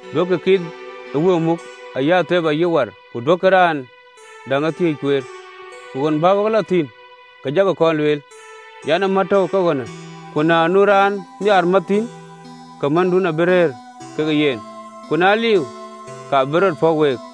Duökï anyɔŋɔ ë wëu muk, ayï athep, ayï war, ku duökï raan däŋ ee thiëëc kueer. Ku ɣön bä wek lɔ thïn ke jakï kɔn lueel an, ‘Ë mät tɔ̈u ke ɣönë.’ Ku na nu raan nhiaar mät thïn, ke mändun abï rëër ke yen, ku na liu, ka bï rɔt pɔ̈k week.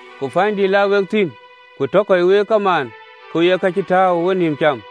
Ku pänydïït la wek thïn, ku tɔ kɔc week ee kamaan, ke we ye ka cï tääu ë wenïïm cam: